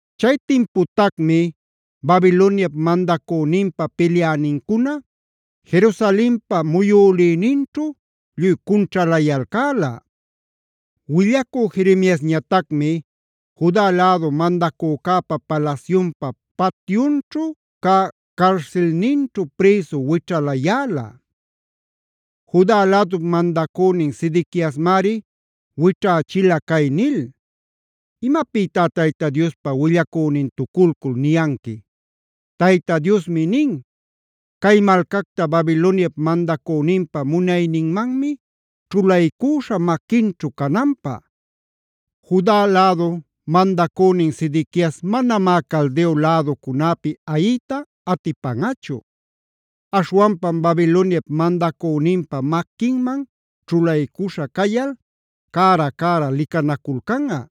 Chay timputacmi Babiloniap mandacüninpa pilyänincuna Jerusalenpa muyülïninćhu lluy cunćhalayalcäla. Willacü Jeremiasñatacmi Juda lädu mandacücäpa palasyunpa patyunćhu cä carsilninćhu prïsu wićhalayäla. Juda lädup mandacünin Sedequiasmari wićhächila cay nil: “Imapïtá Tayta Diospa willacünintuculcul niyanqui: ‘Tayta Diosmi nin: “Cay malcacta Babiloniap mandacüninpa munayninmanmi ćhulaycuśhä maquinćhu cananpä. Juda lädu mandacünin Sedequias manamá Caldeo läducunäpi ayiyta atipanꞌachu. Aśhwanpam Babiloniap mandacüninpa maquinman ćhulaycuśha cayal cära-cära licanaculcanꞌa.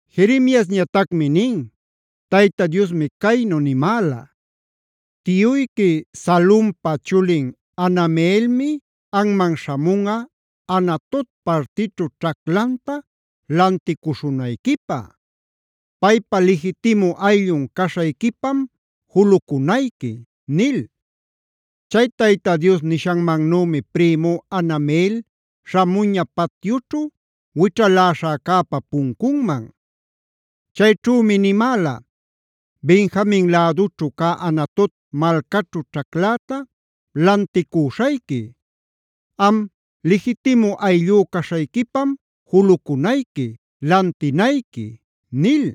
Jeremiasñatacmi nin: “Tayta Diosmi caynu nimäla: ‘Tiyuyqui Salumpa chulin Hanameelmi anman śhamunꞌa Anatot partićhu ćhaclanta lanticuśhunayquipä. Paypa lijitimu ayllun caśhayquipam julucunayqui’ nil. Chay Tayta Dios nishannümi prïmú Hanameel śhamuña patyućhu wićhaläśhäcäpa puncunman. Chayćhümi nimäla: ‘Benjamin lädućhu cä Anatot malcaćhu ćhacläta lanticüśhayqui. Am lijitimu ayllú caśhayquipam julucunayqui, lantinayqui’ nil.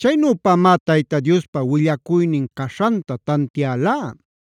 Chaynüpamá Tayta Diospa willacuynin caśhanta tantialá.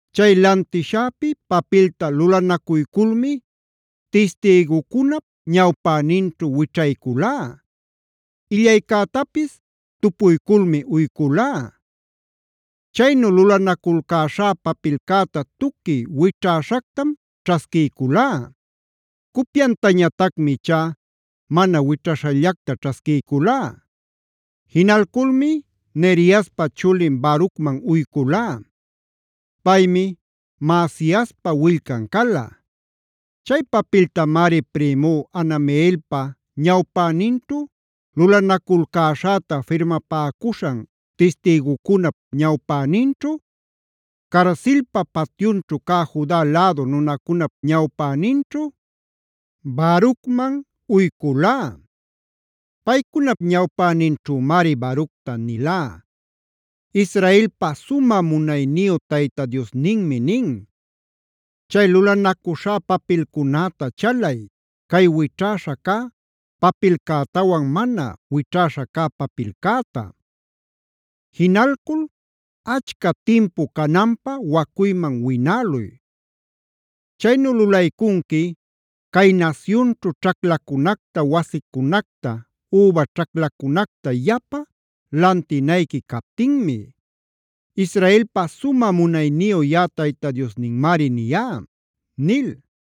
Chay lantishäpi papilta lulanacuyculmi tistïgucunap ñawpäninćhu wićhayculá; illaycätapis tupuyculmi uyculá. Chaynu lulanaculcäśhá papilcäta tuqui wićhäshactam ćhasquiyculá; cupyantañatacmi ichá mana wićhäśhallacta ćhasquiyculá. Jinalculmi Neriaspa chulin Barucman uyculá. Paymi Maasiaspa willcan cala. Chay papiltamari prïmú Hanameelpa ñawpäninćhu lulanaculcäśhäta firmapäcuśhan tistïgucunap ñawpäninćhu, carsilpa patyunćhu cä Juda lädu nunacunap ñawpäninćhu Barucman uyculá. “Paycunap ñawpäninćhümari Baructa nilá: ‘Israelpa sumä munayniyu Tayta Diosninmi nin: Chay lulanacuśhá papilcunäta chalay, cay wićhäśha cä papilcätawan mana wićhäśha cä papilcäta. Jinalcul achca timpu cananpä wacuyman winäluy. Chaynu lulaycunqui cay nasyunćhu ćhaclacunacta, wasicunacta, üba ćhaclacunacta yapa lantinayqui captinmi. Israelpa sumä munayniyu yaꞌa Tayta Diosninmari niyá’” nil.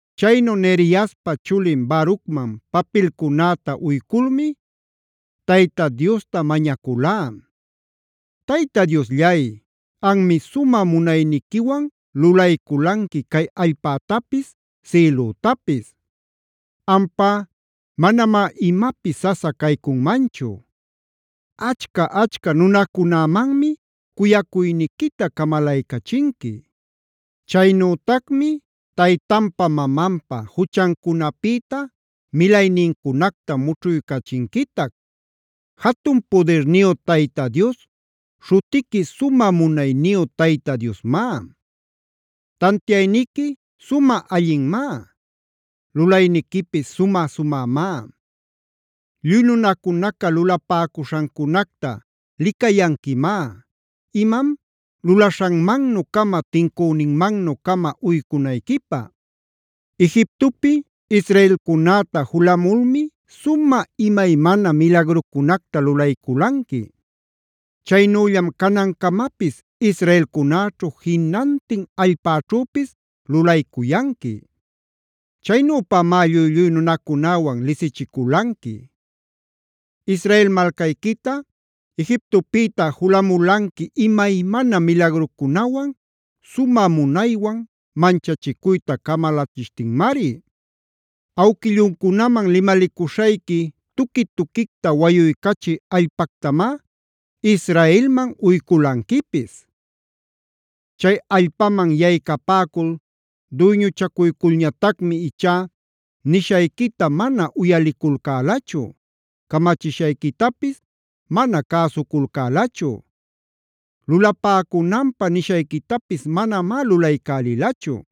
Chaynu Neriaspa chulin Barucman papilcunäta uyculmi Tayta Diosta mañaculá: “Tayta Diosllay, anmi sumä munayniquiwan lulayculanqui cay allpätapis, sïlütapis. Ampá manamá imapis sasa caycunmanchu. Achca-achca nunacunämanmi cuyacuyniquita camalaycachinqui. Chaynütacmi taytanpa mamanpa juchancunapïta milaynincunacta mućhuycachinquitac. Jatun pudirniyu Tayta Dios, śhutiqui Sumä Munayniyu Tayta Diosmá. Tantiayniqui sumä allinmá. Lulayniquipis sumä-sumämá. Lluy nunacuna lulapäcuśhancunacta licayanquimá, imam lulaśhanmannu-cama tincüninmannu-cama uycunayquipä. Egiptopi israelcunäta julamulmi sumä imaymana milagrucunacta lulayculanqui. Chaynüllam canancamapis israelcunäćhu jinantin allpäćhüpis lulaycuyanqui. Chaynüpamá lluy-lluy nunacunäwan lisichiculanqui. Israel malcayquita Egiptopïta julamulanqui imaymana milagrucunawan, sumä munaywan manchachicuyta camalachishtinmari. Awquilluncunaman limalicuśhayqui tuqui-tuquicta wayuycachï allpactamá Israelman uyculanquipis. Chay allpaman yaycapäcul duyñuchacuyculñatacmi ichá nishayquita mana uyaliculcälachu; camachishayquitapis mana cäsuculcälachu. Lulapäcunanpä nishayquitapis manamá lulaycälilachu.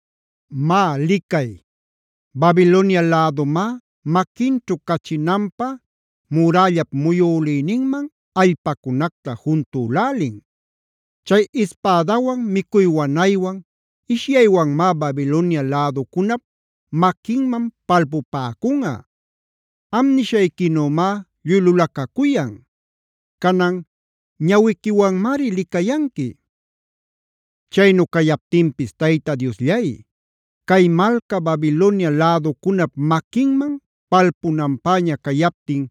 Má licay, Babilonia lädumá maquinćhu cachinanpä murällap muyülïninman allpacunacta juntülälin. Chay ispädawan, micuy wanaywan, ishyaywanmá Babilonia läducunap maquinman palpupäcunꞌa. Am nishayquinümá lluy lulacacuyan. Canan ñawiquiwanmari licayanqui. Caynu cayaptinpis Tayta Diosllay, cay malca Babilonia läducunap maquinman palpunanpäña cayaptin,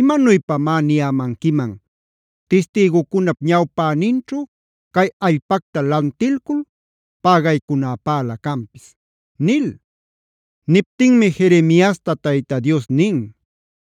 ¿imanuypamá niyämanquiman tistïgucunap ñawpäninćhu cay allpacta lantilcul pägaycunäpälä canpis?” nil. Niptinmi Jeremiasta Tayta Dios nin: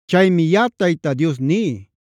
Chaymi yaꞌa Tayta Dios ní: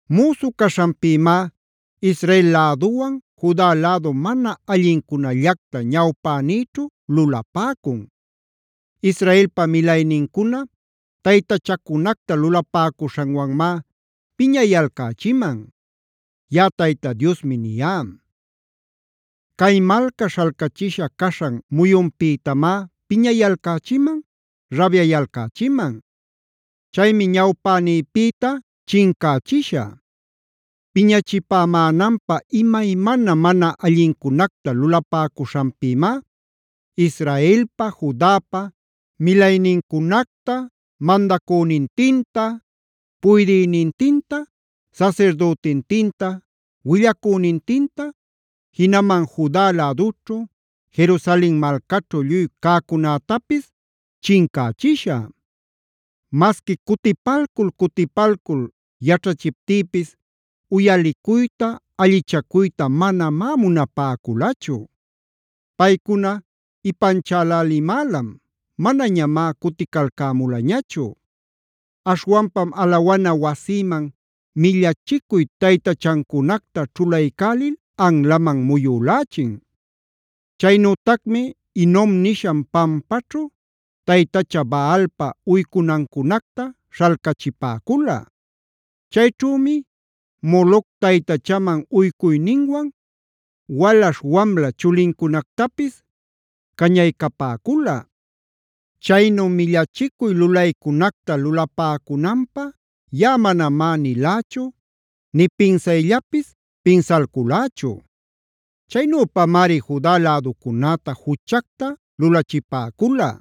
Müsu caśhanpïmá Israel läduwan Juda lädu mana allincunällacta ñawpänïćhu lulapäcun. Israelpa milaynincuna taytachacunacta lulapäcuśhanwanmá piñayalcächiman. Yaꞌa Tayta Diosmi niyá. “Cay malca śhalcachisha caśhan muyunpïtamá piñayalcächiman, rabyayalcächiman. Chaymi ñawpänïpïta chincächishä. Piñachipämänanpä imaymana mana allincunacta lulapäcuśhanpïmá Israelpa, Judapa milaynincunacta, mandacünintinta, puydïnintinta, sasirdütintinta, willacünintinta, jinaman Juda lädućhu, Jerusalen malcaćhu lluy cäcunätapis chincächishä. Masqui cutipalcul-cutipalcul yaćhachiptïpis uyalicuyta, allichacuyta manamá munapäculachu. Paycuna ipanchälälimälam; manañamá cuticalcämulañachu. Aśhwanpam alawana wasïman millachicuy taytachancunacta ćhulaycälil anlaman muyülächin.f Chaynütacmi Hinomg nishan pampaćhu taytacha Baalpa uycunancunacta śhalcachipäcula. Chayćhümi Moloc taytachanmanh uycuyninwan walaśh-wamla chulincunactapis cañaycapäcula. Chaynu millachicuy lulaycunacta lulapäcunanpä yaꞌa manamá nilächu, nï pinsayllapis pinsalculächu. Chaynüpamari Juda läducunäta juchacta lulachipäcula.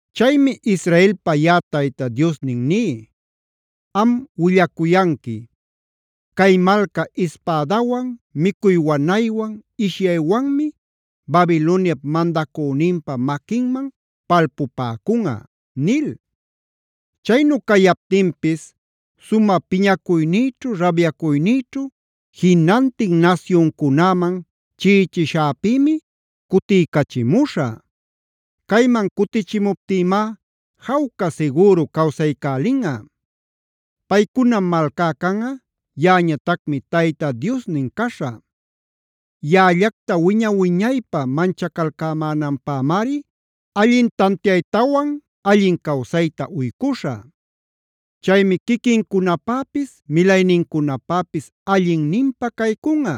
“Chaymi Israelpa yaꞌa Tayta Diosnin ní: Am willacuyanqui: ‘Cay malca ispädawan, micuy wanaywan, ishyaywanmi Babiloniap mandacüninpa maquinman palpupäcunꞌa’ nil. Chaynu cayaptinpis sumä piñacuynïćhu, rabyacuynïćhu jinantin nasyuncunäman chiꞌichishäpïmi cutiycachimuśhä. Cayman cutichimuptïmá jawca sigüru cawsaycälinꞌa. Paycunam malcá canꞌa; yaꞌañatacmi Tayta Diosnin caśhä. Yaꞌallacta wiña-wiñaypä manchacalcämänanpämari allin tantiaytawan allin cawsayta uycuśhä. Chaymi quiquincunapäpis milaynincunapäpis allinninpä caycunꞌa.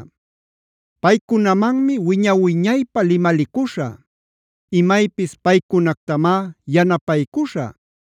Paycunamanmi wiña-wiñaypä limalicuśhä; imaypis paycunactamá yanapaycuśhä;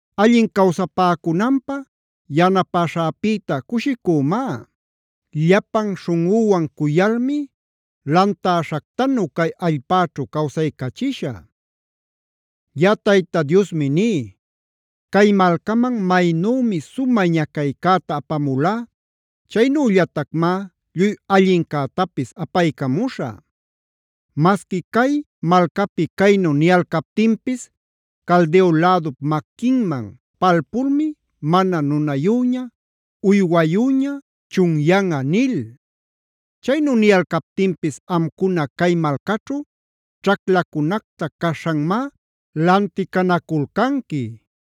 Allin cawsapäcunanpä yanapäśhäpïta cushicümá.j Llapan śhunꞌüwan cuyalmi lantäśhactanu cay allpäćhu cawsaycachishä. “Yaꞌa Tayta Diosmi ní: Cay malcaman maynümi sumä ñacaycäta apamulá, chaynüllatacmá lluy allincätapis apaycamuśhä. Masqui cay malcapi caynu niyalcaptinpis: ‘Caldeo lädup maquinman palpulmi mana nunayüña, uywayüña chunyanꞌa’ nil, chaynu niyalcaptinpis amcuna cay malcaćhu ćhaclacunacta caśhanmá lanticanaculcanqui.